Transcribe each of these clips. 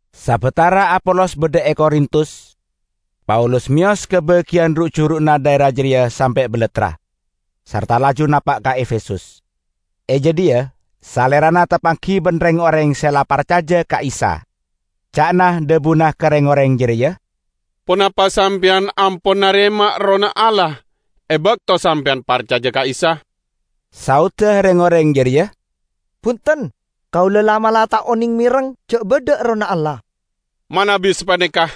Sabatara Apolos badha e Korintus, Paulus meyos ka bagiyan ru'-juru'na dhaera jareya sampe' balattra, sarta laju napa' ka Efesus. E jadhiya salerana tapanggi ban reng-oreng se la parcaja ka Isa. Ca'na dhabuna ka reng-oreng jareya, "Ponapa sampeyan ampon narema Errohna Allah e bakto sampeyan parcaja ka Isa?" Saodda reng-oreng jareya, "Bunten. Kaula la'-mala' ta' oneng mereng ja' badha Errohna Allah." "Manabi sapaneka,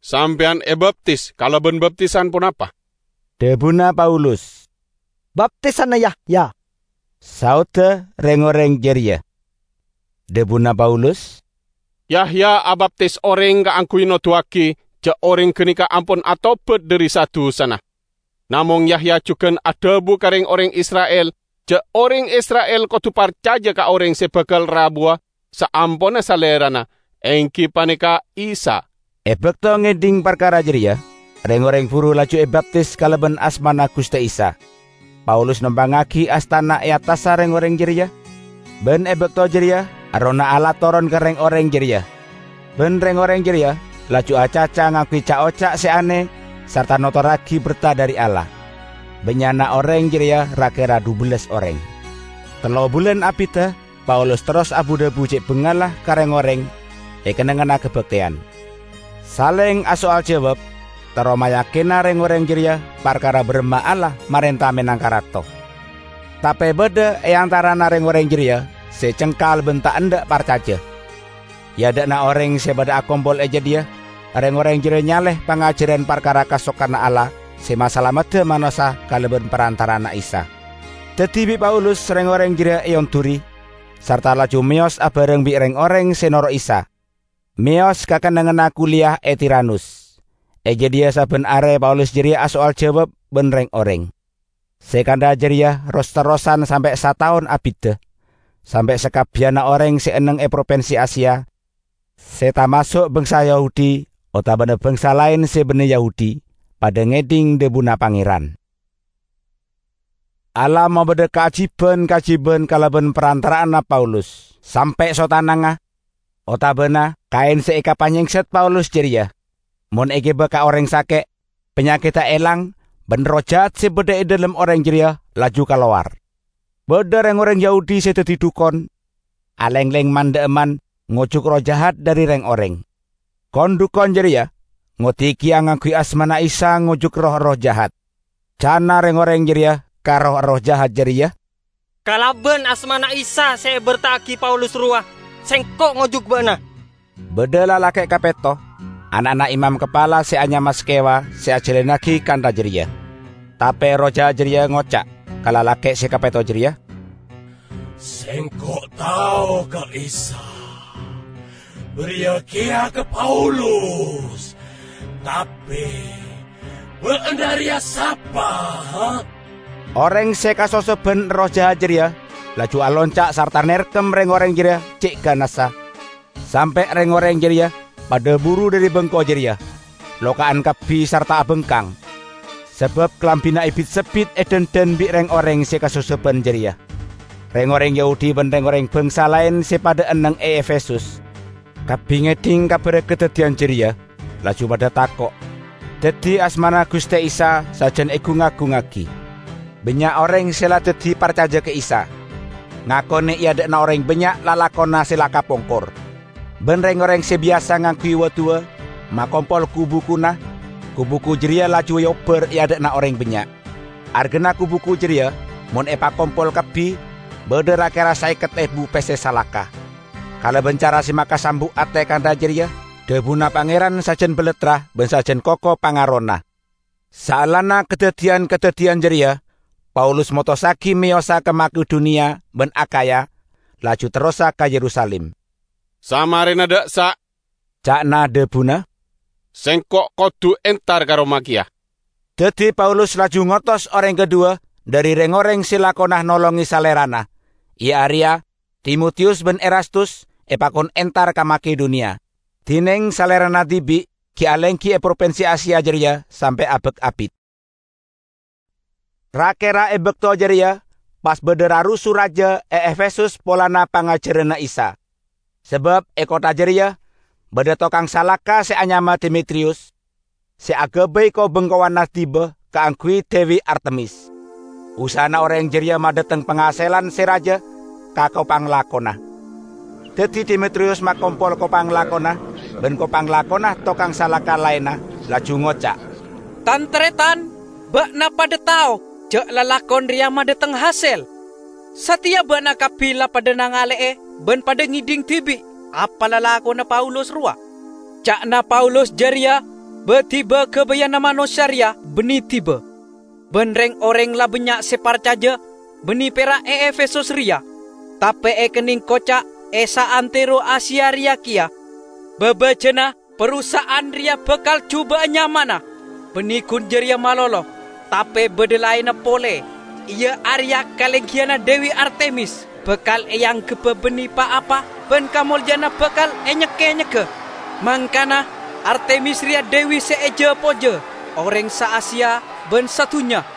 sampeyan ebaptis kalaban baptisan ponapa?" dhabuna Paulus. "Baptisanna Yahya," saodda reng-oreng jareya. Dhabuna Paulus, "Yahya abaptis oreng kaangguy noduwagi ja' oreng ganeka ampon atobat dhari sa-dusana. Namong Yahya jugan adhabu ka reng-oreng Isra'il ja' oreng Isra'il kodu parcaja ka oreng se bakal rabuwa saamponna salerana, enggi paneka Isa." E bakto ngedhing parkara jareya, reng-oreng buru laju ebaptis kalaban asmana Guste Isa. Paulus nompangngagi astana e attassa reng-oreng jareya, ban e bakto jareya Errohna Allah toron ka reng-oreng jareya, ban reng-oreng jareya laju acaca ngangguy ca'-oca' se ane sarta notorragi berta dhari Allah. Bannya'na oreng jareya ra-kera dhubellas oreng. Tello bulan abidda Paulus terros abu-dhabu ce' bangalla ka reng-oreng e kennengnganna kabakteyan, saleng asoal jawab terro mayakina reng-oreng jareya parkara baramma Allah marenta menangka Rato. Tape badha e antarana reng-oreng jareya se cengkal ban ta' endha' parcaja. E adha'na oreng se padha akompol e jadhiya reng-oreng jareya nyale pangajaran parkara kasokanna Allah se masalamedda manossa kalaban parantara'anna Isa. Daddi bi' Paulus reng-oreng jareya eonduri, sarta laju meyos abareng bi' reng-oreng se noro' Isa, meyos ka kennengnganna kuliyah e Tiranus. E jadhiya sabban are Paulus jareya asoal jawab ban reng-oreng. Se kantha jareya ros-terrosan sampe' sataon abidda, sampe' sakabbiyanna oreng se enneng e propinsi Asia, se tamaso' bangsa Yahudi otabana bangsa laen se banne Yahudi, padha ngedhing dhabuna Pangeran. Allah mabadha kaajiban-kaajiban kalaban parantara'anna Paulus. Sampe' sottanangnga otabana kaen se ekapanyengset Paulus jareya mon egiba ka oreng sake', panyakedda elang ban erroh jahat se badha e dhalem oreng jareya laju kalowar. Badha reng-oreng Yahudi se daddi dhukon, alengleng man-dha'emman ngojuk erroh jahat dhari reng-oreng. Kon-dhukon jareya ngoddi keya ngangguy asmana Isa ngojuk roh-erroh jahat. Ca'na reng-oreng jareya ka roh-erroh jahat jareya, "Kalaban asmana Isa se eberta'agi Paulus rowa, sengko' ngojuk ba'na!" Badha lalake' kapetto, ana'na imam kapala se anyama Skewa se ajalannagi kantha jareya. Tape erroh jahat jareya ngoca' ka lalake' se kapetto jareya, "Sengko' tao ka Isa, bariya keya ka Paulus, tape ba'na reya sapa?" Oreng se kasosoban erroh jahat jareya laju alonca' sarta nerkem reng-oreng jareya ce' ganassa sampe' reng-oreng jareya padha buru dhari bengko jareya, loka'an kabbi sarta abangkang, sabab kalambina ebit-sebbit edhandhan bi' reng-oreng se kasosoban jareya. Reng-oreng Yahudi ban reng-oreng bangsa laen se padha enneng e Efesus kabbi ngedhing kabarra kadaddiyan jareya, laju padha tako'. Daddi asmana Guste Isa sajan egung-agungngagi. Bannya' oreng se la daddi parcaja ka Isa, ngakone e adha'na oreng bannya' lalakonna se la kapongkor. Ban reng-oreng se biyasa ngangguy wa'-duwa', makompol ku-bukuna, ku-buku jareya laju eobbar e adha'na oreng bannya'. Argana ku-buku jareya mon epakompol kabbi badha ra-kera saeket ebu pesse salaka. Kalaban cara se makasambu' ate kantha jareya dhabuna Pangeran sajan balattra ban sajan koko pangarona. Saellana kadaddiyan-kadaddiyan jareya, Paulus motossagi meyosa ka Makedoniya ban Akhaya, laju terrosa ka Yerusalim. "Samarena dha' essa'," ca'na dhabuna, "sengko' kodu entar ka Roma keya." Daddi Paulus laju ngotos oreng kadhuwa dhari reng-oreng se lakona nolonge salerana, iya areya Timotiyus ban Erastus, epakon entar ka Makedoniya; dineng salerana dibi' gi' alenggi e propinsi Asia jareya sampe' abak abit. Ra-kera e bakto jareya pas badha rarusu raja e Efesus polana pangajaranna Isa. Sabab e kottha jareya badha tokang salaka se anyama Demetriyus, se agabay ko-bengkowanna diba kaangguy Dewi Artemis. Usahana oreng jareya madhateng pangaselan se raja ka ko-panglakona. Daddi Demetriyus makompol ko-panglakona ban ko-panglakona tokang salaka laenna, laju ngoca', "Tan-taretan! Ba'na padha tao ja' lalakon reya madhateng hasel. Sateya ba'na kabbi la padha nangale'e ban padha ngedhing dibi' apa lalakonna Paulus rowa. Ca'na Paulus jareya ba-diba gabayanna manossa reya banne diba. Ban reng-oreng la bannya' se parcaja, banne pera' e Efesus reya, tape ekenneng koca' e saantero Asia reya keya. Babajana, parusaha'an reya bakal juba'a nyamana. Banne gun jareya malolo, tape badha laenna pole, iya areya kalenggiyanna Dewi Artemis bakal eanggebba banne pa-apa ban kamolja'anna bakal enyek-enyegga; mangkana Artemis reya dewi se eja-pojja oreng sa Asia ban sadunnya!"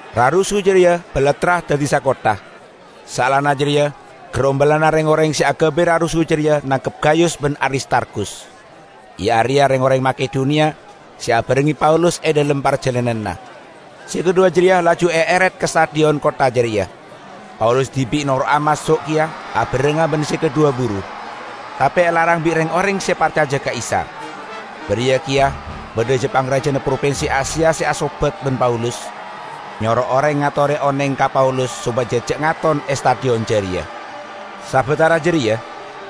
Rarusu jareya balattra daddi sakottha. Saellana jareya garombolanna reng-oreng se agabay rarusu jareya nangkep Gayus ban Aristarkhus, iya areya reng-oreng Makedoniya se abarengnge Paulus e dhalem parjalananna; se kadhuwa jareya laju eeret ka stadion kottha jareya. Paulus dibi' noro'a maso' keya abarengnga ban se kadhuwa buru, tape elarang bi' reng-oreng se parcaja ka Isa. Bariya keya badha ja-pangrajana propinsi Asia se asobat ban Paulus, nyoro oreng ngatore oneng ka Paulus sopaja ja' ngaton e stadion jareya. Sabatara jareya,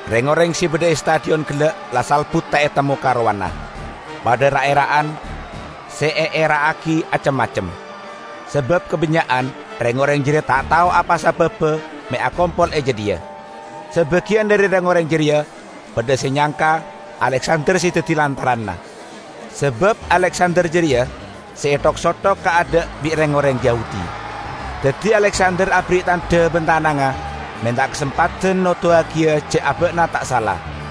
reng-oreng se badha e stadion gella' la salbut ta' etemmo karowanna. Padha ra'-era'an; se eera'agi acem-macem, sabab kabannya'an reng-oreng jareya ta' tao apa sababba me' akompol e jadhiya. Sabagiyan dhari reng-oreng jareya badha se nyangka Aleksander se daddi lantaranna, sabab Aleksander jareya se ethok-sothok ka adha' bi' reng-oreng Yahudi. Daddi Aleksander aberri' tandha ban tanangnga menta kasempadan noduwagiya ja' aba'na ta' sala.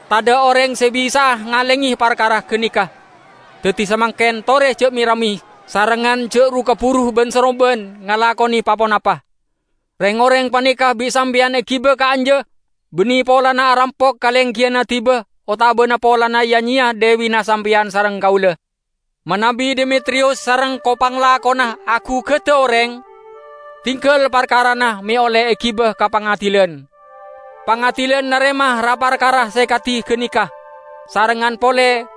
Tadha' oreng se bisa'a ngalenge parkara ganeka. Daddi samangken tore ja' me-ramme, sarengngan ja' ru-kaburu ban-saromban ngalakone pa-ponapa. Reng-oreng paneka bi' sampeyan egiba ka'anja banne polana arampok kalenggiyanna diba otabana polana ya-nyeya dewina sampeyan sareng kaula. Manabi Demetriyus sareng ko-panglakona agugada oreng, dinggal parkarana me' olle egiba ka pangadilan. Pangadilan narema ra-parkara se kadi ganeka, sarengngan pole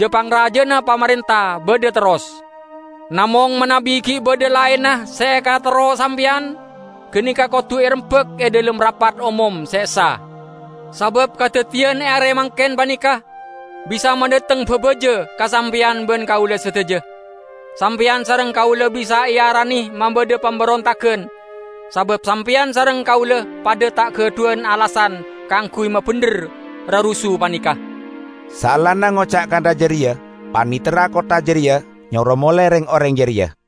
ja-pangrajana pamarenta badha terros. Namong manabi gi' badha laenna se ekaterro sampeyan, ganeka kodu erembak e dhalem rapat omom se essa. Sabab kadaddiyan e are mangken paneka bisa madhateng babaja ka sampeyan ban kaula sadaja. Sampeyan sareng kaula bisa earane mabadha pamberontagan, sabab sampeyan sareng kaula padha ta' gadhuwan alasan kaangguy mabendher rarusu paneka." Saellana ngoca' kantha jareya, panitera kottha jareya nyoro mole reng-oreng jareya.